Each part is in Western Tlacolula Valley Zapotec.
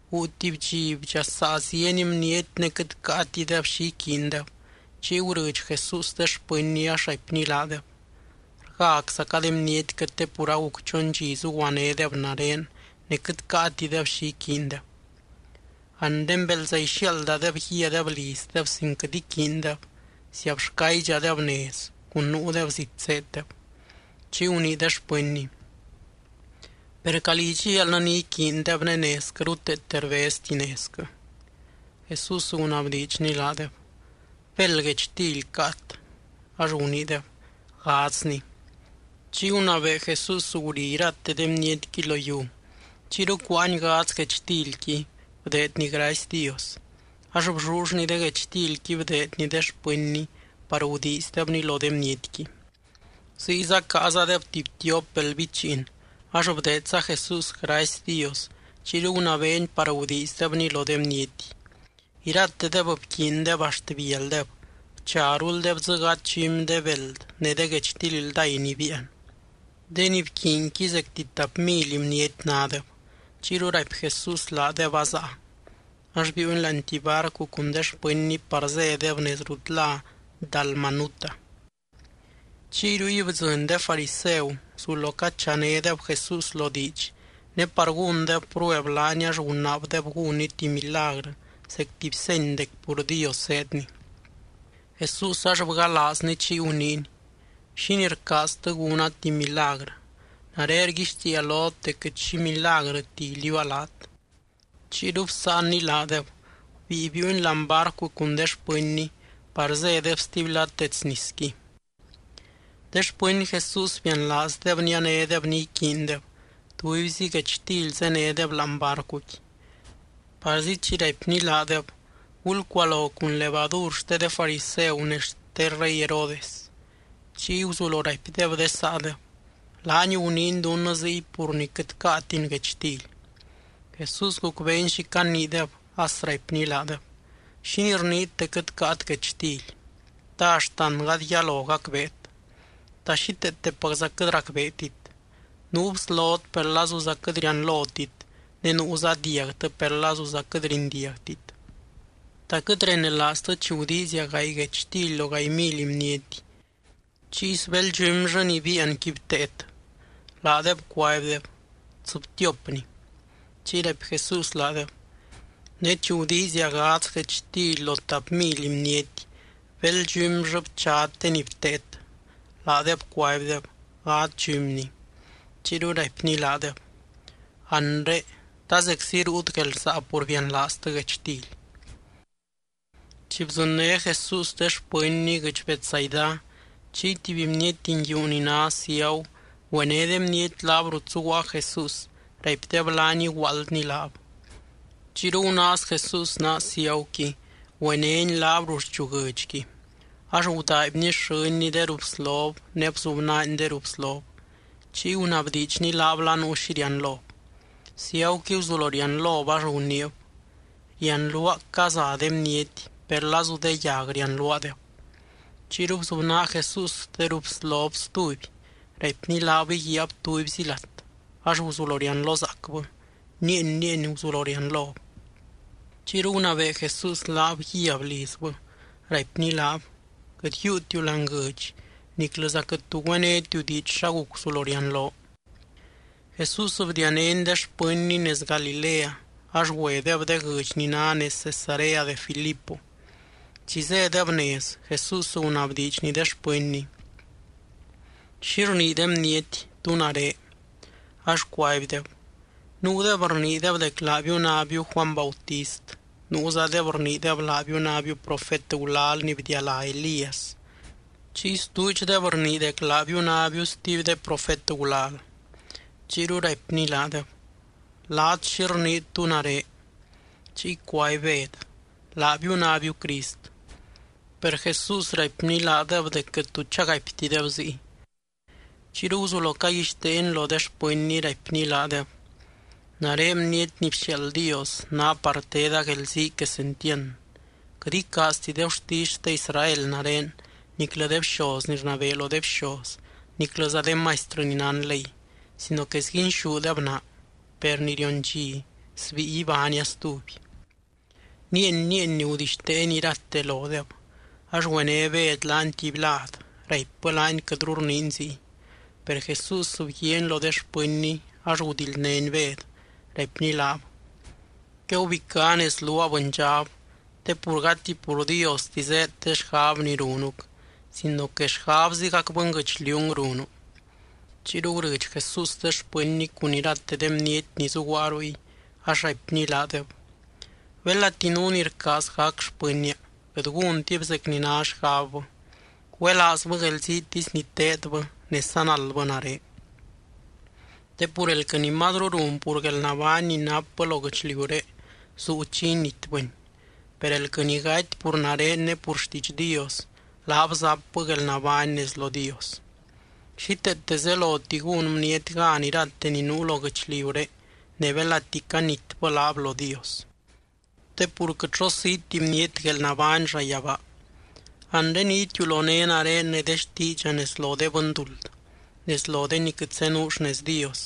Guu tuby dxi, bdxasaa zieny bniety ne quɨt caatideb xi iquiindeb. Chiy gurɨdx Jesús de xpɨnny ax raipny laadeb: —Rgáczaca de bnietquɨ te pur aguc chon dxi zuguanédeb nare ne quɨt caatideb xi iquiindeb. Anre belza ixiaaldadeb guíadeb lizdeb sin quɨt iquiintideb, ziabxcaydxadeb nez cun nuudeb zit zéeddeb. Chiy gunii de xpɨnny: —Per, ¿calí idxial ni iquiindeb ne nezquɨ ruteete rbezti nezquɨ? Jesús gunabdiidxny laadeb: —¿Béld guechtily caat? Ax guniideb: —Gadzni. Chiy gunabee Jesús guri irate de bnietqui lo yiu. Chiyru cuáany gadz guechtilqui, bdeedny gracy Dios. Ax bllullny de guechtilqui bdeedny de xpɨnny par gudiizdebni lo de bnietqui. Ziyza caazadeb tuby tiop beld bichiin ax bdeedza Jesús gracy Dios, chiyru gunabeeny par gudiizdebni lo de bniety. Iratedeb bquiindeb axt bialdeb, bcharuldeb dzɨ gadz dxumy de beld ne de guechtily ldáy ni biian. De ni bquiinqui zecti tap mily bniety nádeb. Chiyru raipy Jesús laadeb azaa. Ax biiuny láani tuby barcu cun de xpɨnny par zédeb nez rut lá Dalmanuta. Chiy ruy bdzɨny de fariseu, guzulo cachanédeb Jesús lo diidx, ne par gúndeb prueb laany ax gunaabdeb gúnny tuby milagrɨ zec tuby seny dec pur Dios zéedny. Jesús ax bgalaazny chiy guniiny: —¿Xínii rcaaztɨ gúna tuby milagrɨ? Nare rguixtiia lot dec quɨt xi milagrɨti iliuua laat. Chiyru bsáanny laadeb, gubíi biiuny láani barcu cun de xpɨnny par zédeb stuby lad dets nisqui. De xpɨny Jesús bianlaazdeb nianédeb ni iquiindeb, tubyzi guechtily zénedeb láani barcuqui. Parzi chi raipny laadeb: —Gulcualo cun levadur xte de fariseu ne xte rey Herodes. Chiy guzulo raipdeb de saadeb: —Laany guniiny dunnɨ ziy pur ni quɨt caatin guechtily. Jesús gucbeeny xi caniideb as raipny laadeb: —¿Xínii rniit dec quɨt caat guechtily? ¿Ta axtan gady yalo gacbeet? ¿Ta xíteetepacza quɨt racbeetit? Nuu bslot per lazuza quɨt rianlotit ne nuuza diagtɨ, per lazuza quɨt rindiagtit. ¿Ta quɨt renelaaztɨ chi gudiizia gaay guechtily lo gaay mily bniety? Chiy, ¿sbéld dxumyllɨ ni biianqui bteet? Laadeb cuaibdeb: —Tsɨbtiopni. Chiy raipy Jesús laadeb: —Ne chi gudiizia gadz guechtily lo tap mily bniety, ¿béld dxumyllɨ bchat de ni bteet? Laadeb cuaibdeb: —Gadz dxumni. Chiyru raipny laadeb: —Anre, ¿ta zeczi ruut guelrsaa pur bianlaaztɨ guechtily? Chi bdzɨnné Jesús de xpɨnny guɨdx Betsaida, chiy tuby bniety nguiu ni ná ciagu, güené de bniety laab rut zuguaa Jesús, raipdeb laany iguaaldny laab. Chiyru gunaaz Jesús naa ciaguqui, güenény laab ruxchu guɨdxqui. Ax gudaaibny xɨ́nny de ruu bslob ne bzubnaany de ruu bslob. Chiy gunabdiidxny laab la nuu xi rianlob. Ciaguqui guzulo rianlob ax guniib: —Rianluaa caza de bniety, per lazu de yag rianluaadeb. Chiyru bzubnaa Jesús de ruu bslob stuby. Raipny laab íguiab tubyzi lat ax guzulo rianlozaacbɨ, nieeny, nieeny guzulo rianlob. Chiyru gunabee Jesús laab guíab lizbɨ, raipny laab: —Quɨt yiiutiu láani guɨdx niclɨza quɨt tu güénetiu diidx xa guc guzulo rianloo. Jesús bdianény de xpɨnny nez Galilea ax güedeb de guɨdx ni ná nez Cesarea de Filipo. Chi zédeb nez, Jesús gunabdiidxny de xpɨnny: —¿Xi rnii de bniety tú nare? Ax cuaibdeb: —Nuudeb rniideb dec laabiu nábiu Juany Bautist. Nuuzadeb rniideb laabiu nábiu profet gulal ni bdialá Elías. Chiy stuudxdeb rnii dec laabiu nábiu stuby de profet gulal. Chiyru raipny laadeb: —Laat, ¿xi rniit, tú nare? Chiy cuaby Bed: —Laabiu nábiu Crist. Per Jesús raipny laadeb dec quɨt tu chagaiptideb ziy. Chiyru guzulo caguixteeny lo de xpɨnny, raipny laadeb: —Nare Bniety ni bxiaald Dios, ná par teda guelzii quesentiand. Quɨt icaazti de gurtisy xte Israel nare niclɨ de bxoz ni rnabee lo de bxoz niclɨza de maistrɨ ni nán ley, sino que sguinxúdeb naa. Per ni rion dxi, sbíi ibánia stuby. Nieeny, nieeny gudixteeny irate lodeb. Ax güené Bed laany tuby lad, raipbɨ laany quɨtru rniiny ziy. Per Jesús bguiaany lo de xpɨnny ax gudildnény Bed, raipny laab: —¡Quegubicá nez luaa, bɨndxab! Te pur gati pur Diosti zéed de xgab ni runuc sino que xgabzigac bɨnguɨchliung runu. Chiyru gurɨdx Jesús de xpɨnny cun irate de bniety ni zuguaa ruy ax raipny laadeb: —Belati nuu ni rcaaz gac xpɨnnia, quɨt gúntib zec ni ná xgabbɨ, güelaazbɨ guelziitisy ni teedbɨ ne sanaldbɨ nare. Te pur elquɨ ni mazru run pur guelnabány ni napbɨ lo guɨchliuré zuu chi initbɨni. Per elquɨ ni gaty pur nare ne pur xtiidx Dios, laab zapbɨ guelnabány nez lo Dios. Xíteete zeloti gún bniety gan irate ni nuu lo guɨchliuré ne belati canitbɨ laab lo Dios. Te pur quɨt xo siiti bniety guelnabány llayabaa. Anre ni itiuloné nare ne de xtiidxa nez lo de bɨnduld, nez lo de ni quɨt zenuu xnez Dios,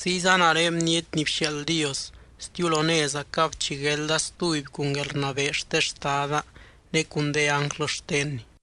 ziyza nare Bniety ni bxiaald Dios stiulonézacab chi guelda stuby cun guelrnabee xte Xtada ne cun de ánglɨ xtenny.